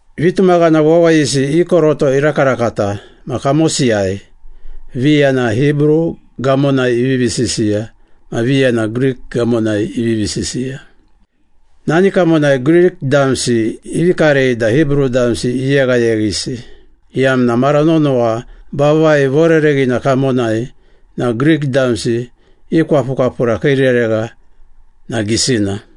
Vitumaghana wawayisi i koroto irakarakata ma kamosiyai, viya na Hibru gamonai ivivi sisiya ma viya na Grik gamonai ivivi sisiya. Nani kamonai Grik damsi ivi karei da Hibru damsi iyeghayeghisi, iyamna mara nonowa vavai vorereghina kamonai na Grik damsi i kwapukwapura kii reregha na gisina.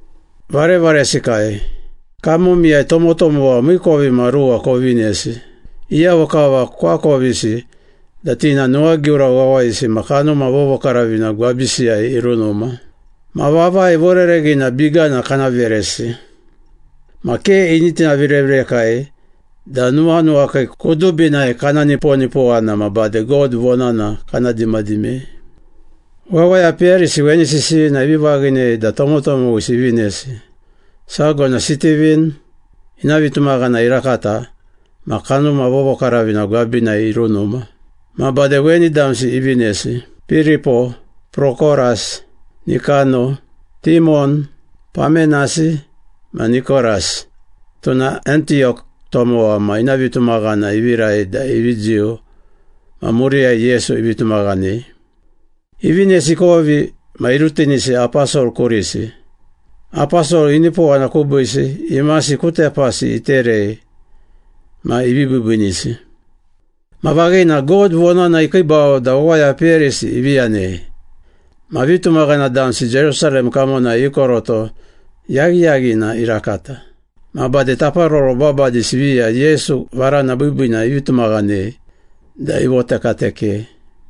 Varevaresikai, kamomiyai tomotomowa miikovimaruwa kovinesi, iyavo kava koakovisi da ti na nuwagiura wawayisi ma Kanuma Vovokaravina gwabisiyai irunuma. Ma vavai vorereghina bigana kana veresi. Ma ke ini tinaviravirekai da nuwanuwakii kudubinai kana niponipowana ma bade God vonana kana dimadimei.” Wawaya peyarisi weni sisiyina ivi vaghinei da tomotomowisi ivinesi. Sago na Sitivin, ina vitumaghana irakata ma Kanuma Vovokaravina gwabinai irunuma. Ma bade weni damsi ivinesi. Piripo, Prokoras, Nikano, Timon, Pamenasi, ma Nikoras (tuna Antiyok tomowa ma ina vitumaghana ivirai da ivi Jiu ma muriyai Yesu ivi tumaghanei). Ivinesi ikovi ma irutinisi aposol kurisi. Aposol inipowana kubiisi, imasi ku tepasi iterei ma ivi biibiinisi. Ma vaghina, God vonana ikiibau da wawaya peyarisi ivi yanei. Ma vitumaghana damsi Jerusalem kamonai i koroto yaghiyaghina irakata. Ma bade taparoro babadisi viya Yesu Varana Biibiina ivi tumaghanei da ivotekatekei.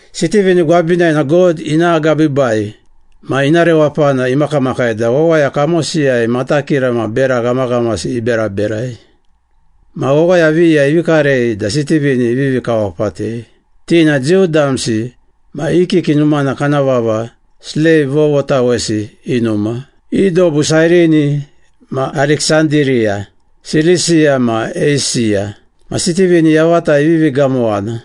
Sitivin gwabinai na God ina agabiibai ma ina rewapana imakamakai da wawaya kamosiyai matakira ma bera ghamaghamasi iberaberai. Ma wawaya viya ivi karei da Sitivin ivivi kawapatei. Ti na Jiu damsi ma i kiki numana kana vava ‘Sleiv vovotawesi i numa.’ I dobu Sairini ma Ariksandiriya, Silisiya ma Eisiya. Ma Sitivin yavata ivivi gamowana,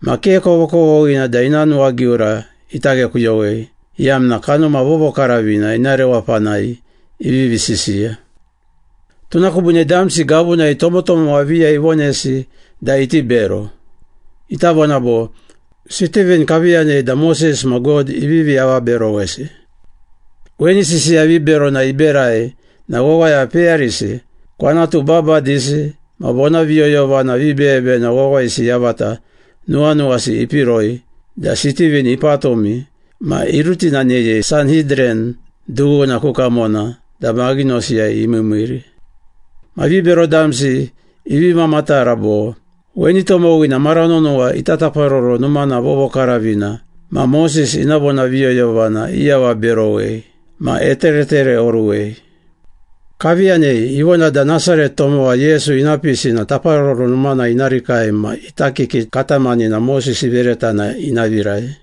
ma ke kovokovoghina da ina nuwagiura ita ghekuyowei, iyamna Kanuma Vovokaravina ina rewapanai ivivi sisiya. Tuna kubiine damsi gavunai tomotomowa viya ivonesi da iti bero. Ita vona bo, “Sitivin kavi yanei da Moses ma God ivivi avaberowesi.” Weni sisiya viberona iberai na wawaya peyarisi, kwanatu babadisi ma vonaviyoyovana vibeyebeyena wawayisi yavata nuwanuwasi ipiroi da Sitivin ipatumi ma irutinaneyei Sanhidran dughuna ku kamona da maghinosiyai imiimiiri. Ma vibero damsi ivi mamatara bo, “Weni tomowina mara nonowa ita Taparoro Numana Vovokaravina ma Moses ina vonaviyoyovana iavaberowei ma eteretereoruwei. Kavi yanei, ivona da Nasaret tomowa Yesu ina pisi na Taparoro Numana ina rikai ma ita kiki katamanina Moses ivereta na ina virai.”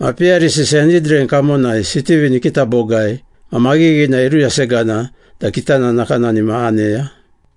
Ma peyarisi Sanhidran kamonai Sitivin ikita bogai ma maghighina iruyasegana da kitana nakanani ma aneya.